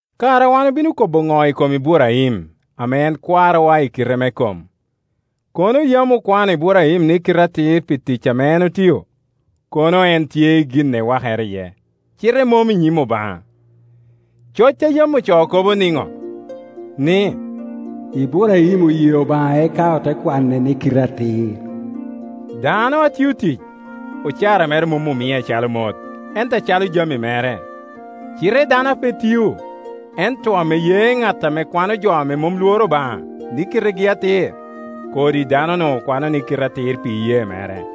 Kara wan obino kobo ŋo i kom Iburaim, ame en kwarowa i kite me kom? Kono yam okwano Iburaim ni kite atir pi tic ame otio, kono en tye i gin ewakere iye, cite mom i nyim Obaŋa. Coc a yam ocoo kobo niŋo? Ni, “Iburaim oye Obaŋa eka ote kwane ni kite atir.” Dano a tio tic, ocara mere mom omie acalo mot, ento acalo jami mere; cite dano a pe tio, ento ame ye ŋat ame kwano jo a mom lworo Obaŋa ni kitegi atir, kodi dano-nu okwano ni kite atir pi iyee mere.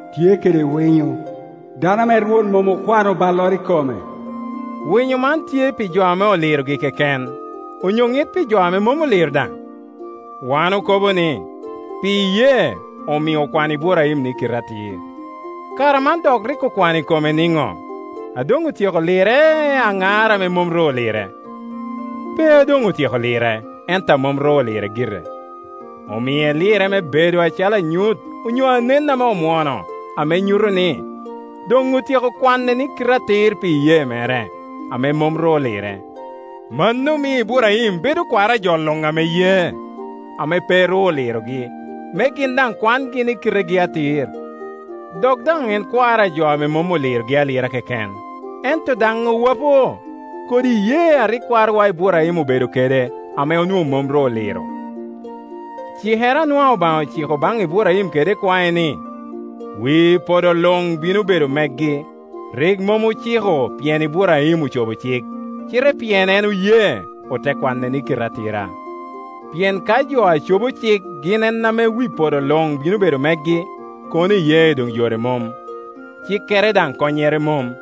tye kede winyo, dano ame Rwot mom okwano balloro i kome.” Winyo man tye pi jo ame olirogi keken, onyo ŋit pi jo a mom oliro daŋ? Wan okobo ni, pi iyee omio okwano Iburaim ni kite atir. Kara man dok rik okwano i kome niŋo? A doŋ otyeko lire, aŋar ame mom ru olire? Pe a doŋ otyeko lire, ento a mom ru olire gire. Omie lirre me bedo acalo anyut onyo anen ame omwoŋo, ame nyuto ni, doŋ otyeko kwane ni kite atir pi iyee mere, ame mom ru olire. Mano mio Iburaim bedo kwaro a jo luŋ ame ye ame pe ru olirogi, me gin daŋ kwangi ni kitegi atir; dok daŋ en kwaro a jo a mom olirogi alira keken, ento daŋ owopo kodi iyee a rik kwarowa Iburaim obedo kede ame onwoŋo mom ru oliro. Cikere a nwaŋ Obaŋa ociko baŋ Iburaim kede ikwae, ni, wi podo luŋ bino bedo megi, rik mom ociko pien Iburaim ocobo cik, cite pien en oye, ote kwane ni kite atira. Pien ka jo a cobo cik gin en ame wi podo luŋ bino bedo megi, kono iyee doŋ yore mom, cikere daŋ konnyere mom.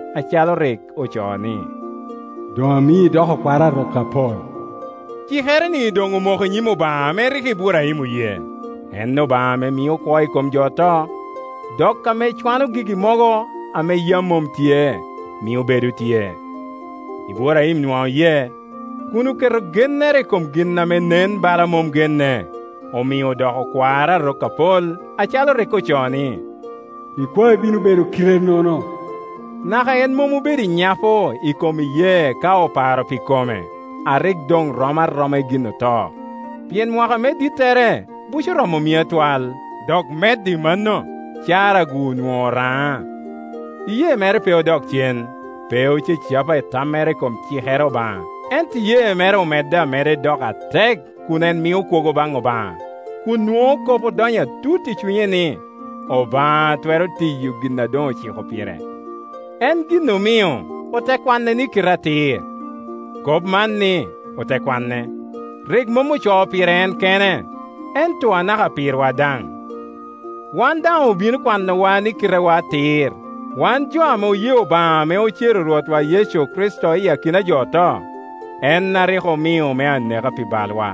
acalo rik ocoo ni, “Doŋ amii idoko kwaro a rok apol.” Cikere-ni doŋ omoko i nyim Obaŋa ame rik Iburaim oye, en Obaŋa ame mio kwo i kom jo oto, dok ame cwano gigi mogo a yam mom tye, mio bedo tye. Iburaim nwaŋ oye, kun oketo gennere i kom gin ame nen bala mom genne, omio odoko kwaro a rok apol, acalo rik ocoo ni, “Ikwai bino bedo kite-nono.” Naka en mom obedo i nyapo i kom iyee ka oparo pi kome, a rik doŋ rom aroma i gin oto, pien mwaka me dittere buco romo mia twal, dok medo i mano Cara-gu onwoŋo oraŋa. Iyee mere pe odok cen, pe ocacapa i tammere i kom cikere Obaŋa, ento iyee mere omedde ameda i doko atek kun en mio kwogo baŋ Obaŋa, kun nwoŋo kop odonyo atut i cunye ni, Obaŋa twero tiyo gin a doŋ ociko pire. En gin omio “ote kwane ni kite atir.” Kop man ni, “ote kwane” rik mom ocoo pire en kene, ento anaka pirwa daŋ. Wan daŋ obino kwanowa ni kitewa atir, wan jo ame oye Obaŋa ame ocero Rwotwa Yecu Kricito iyi akina ajo oto, en a rik omio me aneka pi bal wa,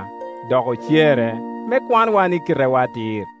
dok ocere me kwanwa ni kitewa atir.